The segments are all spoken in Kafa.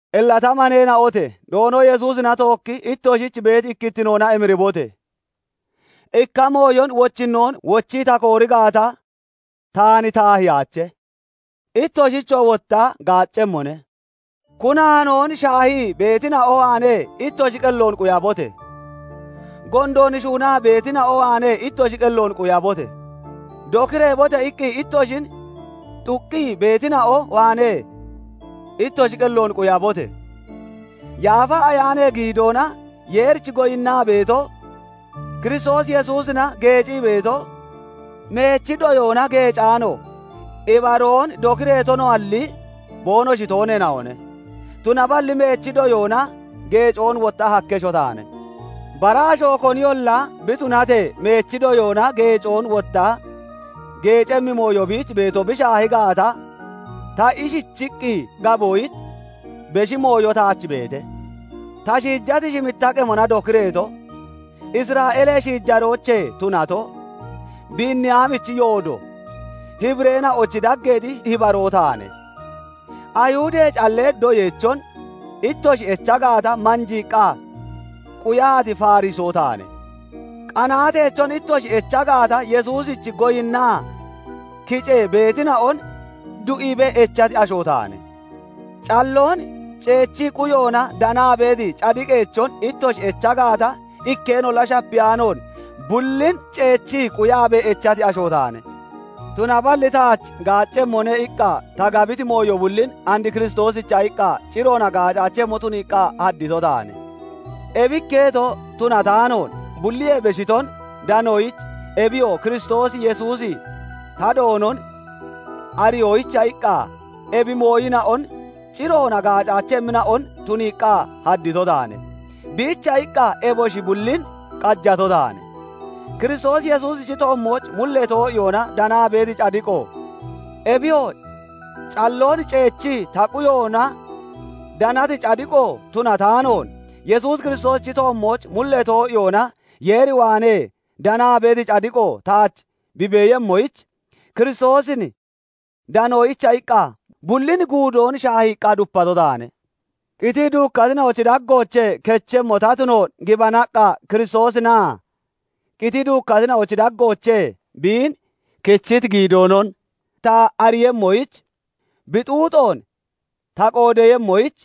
Illa ta maneena'ote! Doono Yesuusina tookkii ittoshich beeti ikkittinoona emiribote! Ikka mooyon wochinnoon wochii ta koori gaata taan taahiyaache; ittoshichoo wotta gaaccemmone. Kunaanoon shaahii beetina'o waanee ittoshi qelloon quyabote! Gondoon shuunaa beetina'o waanee ittoshi qelloon quyabote! "Dokireebote!" iqqi ittoshin xuqqi beetina'o waanee ittoshi qelloon quyabote! Yaafa Ayaanee giidoona Yeerich goyinnaa beeto, Kiristoos Yesuusina geecii beeto, meechi doyoona geecaano, ibaroon dokireeto noalli, boonoshi tooneena'one. Tunaballi meechi doyoona geecoon wotta hakkesho taane. Bara asho koniyolla bi tunatee meechi doyoona geecoon wotta geecemmi mooyo biich beeto bi shaahi gaata, ta ishichiqqi gaboyich beshi mooyo taach beete. Ta shiijati shimitta qemona dokireeto, Isra'eelee shiijaroochee tunato, Biiniyaamichi yoodo, Hibireena'ochi daggeexi Hibaroo taane. Ayihudee callee doyeechon ittoshi echa gaata, manjiiqqa quyati Farisoo taane. Qanaateechon ittoshi echa gaata, Yesuusich goyinniya kicee beetina'on du'iibee echati asho taane. Calloon ceechii quyoona danaa beeti cadiqeechon ittoshi echa gaata, ikkeenolla shapiyaanoon bullin ceechii quyaabee echati asho taane. Tunaballi taach "Gaaccemmone" iqqa ta gabiti mooyo bullin and Kiristoosicha iqqa ciroona gaacaachemmo tuniiqqa haddito taane. Ebi ikketo tunataanoon, bulliyee beshiton danoyich ebiyoo Kiristoos Yesuusi ta Doonon ariyoyicha iqqa ebi mooyina'on ciroona gaacaachemmina'on tuniiqqa haddito taane. Biicha iqqa eboshi bullin qajato taane. Kiristoos Yesuusichi toommooch mullee too'iyoona danaa beeti cadiqo, ebiyoo calloon ceechii ta quyoona danati cadiqo tunataanoon, Yesuus Kiristoosichi toommooch mullee too'iyoona Yeer waanee danaa beeti cadiqo taach bi beeyemmoyich, Kiristoosin danoyicha iqqa bullin guudoon shaahiiqqa dupato taane. Qitii duukkatina'ochi daggoochee kechemmo ta tunoon gibanaqqa Kiristoosinaa qitii duukkatina'ochi daggoochee biin kechiti giidoonon ta ariiyemmoyich, bi xuuxoon ta qoodeeyemmoyich,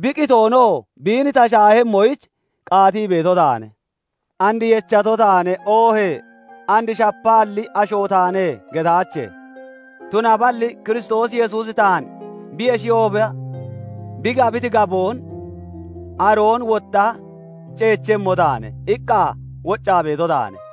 bi qitoonoo biin ta shaahemmoyich qaatii beeto taane. "And yechato taane" oohee "And shapaalli asho taane" getaache; tunablli Kiristoos Yesuusi taan bi yeshiyooba bi gabiti gaboon aroon wotta "Ceechemmo taane" iqqa woccaa beeto taane.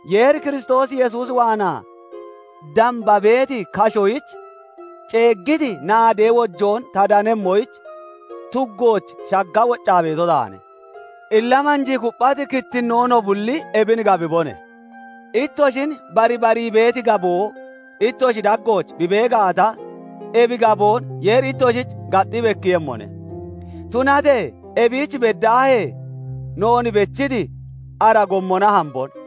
Yeeri Kiristoos Yesuus waanaa damba beeti kashoyich ceeggiti naadee wojoon ta danemmoyich, tuggooch shagga woccaa beeto taane. Illa manjii kupphati kittinnoo no bulli ebin gabibone; ittoshin barbarii beeti gaboo ittoshi daggooch bi bee gaata, ebi gaboon Yeeri ittoshich gaxxi bekkiiyemmone. Tunatee ebiich beddaahee noon bechiti ara gommona hambone.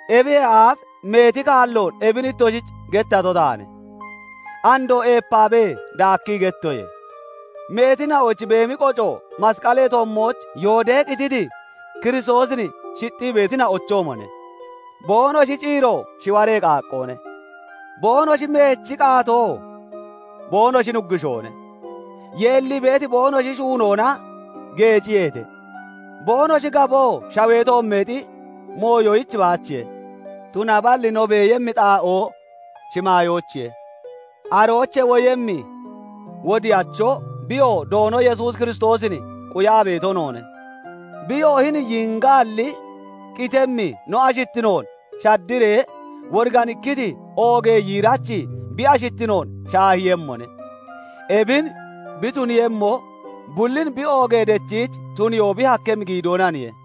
Ebiyee aaf meeti kalloon ebin ittoshich gettato taane. Andoo eepaabee daakkii gettoye; meetina'ochi beemi qoco masqalee toommooch yooddee qititi Kiristoosin shixxii beetina'ochoomone; boonoshi ciiro shiwaree qaaqqoone; boonoshi meechi qaatoo boonoshich nuggushoone; yeellii beeti boonoshi shuunoona geeciyeete; boonoshi gaboo shawee toommeexi mooyoyich baachiye. Tunaballi no beeyemmi xaa'oo shimaayoochiye. Aroochee woyemmi wodiyacho, biyoo Doono Yesuus Kiristoosin quyaa beeto noone. Biyoo hini yiingaalli, qitemmi no ashittinoon shaddiree, woriganikkiti oogee yiirachi bi ashittinoon shaahiiyemmone. Ebin bi tuniiyemmo bullin bi oogee dechiich tuniyoon bi hakkemmi giidoonaniye.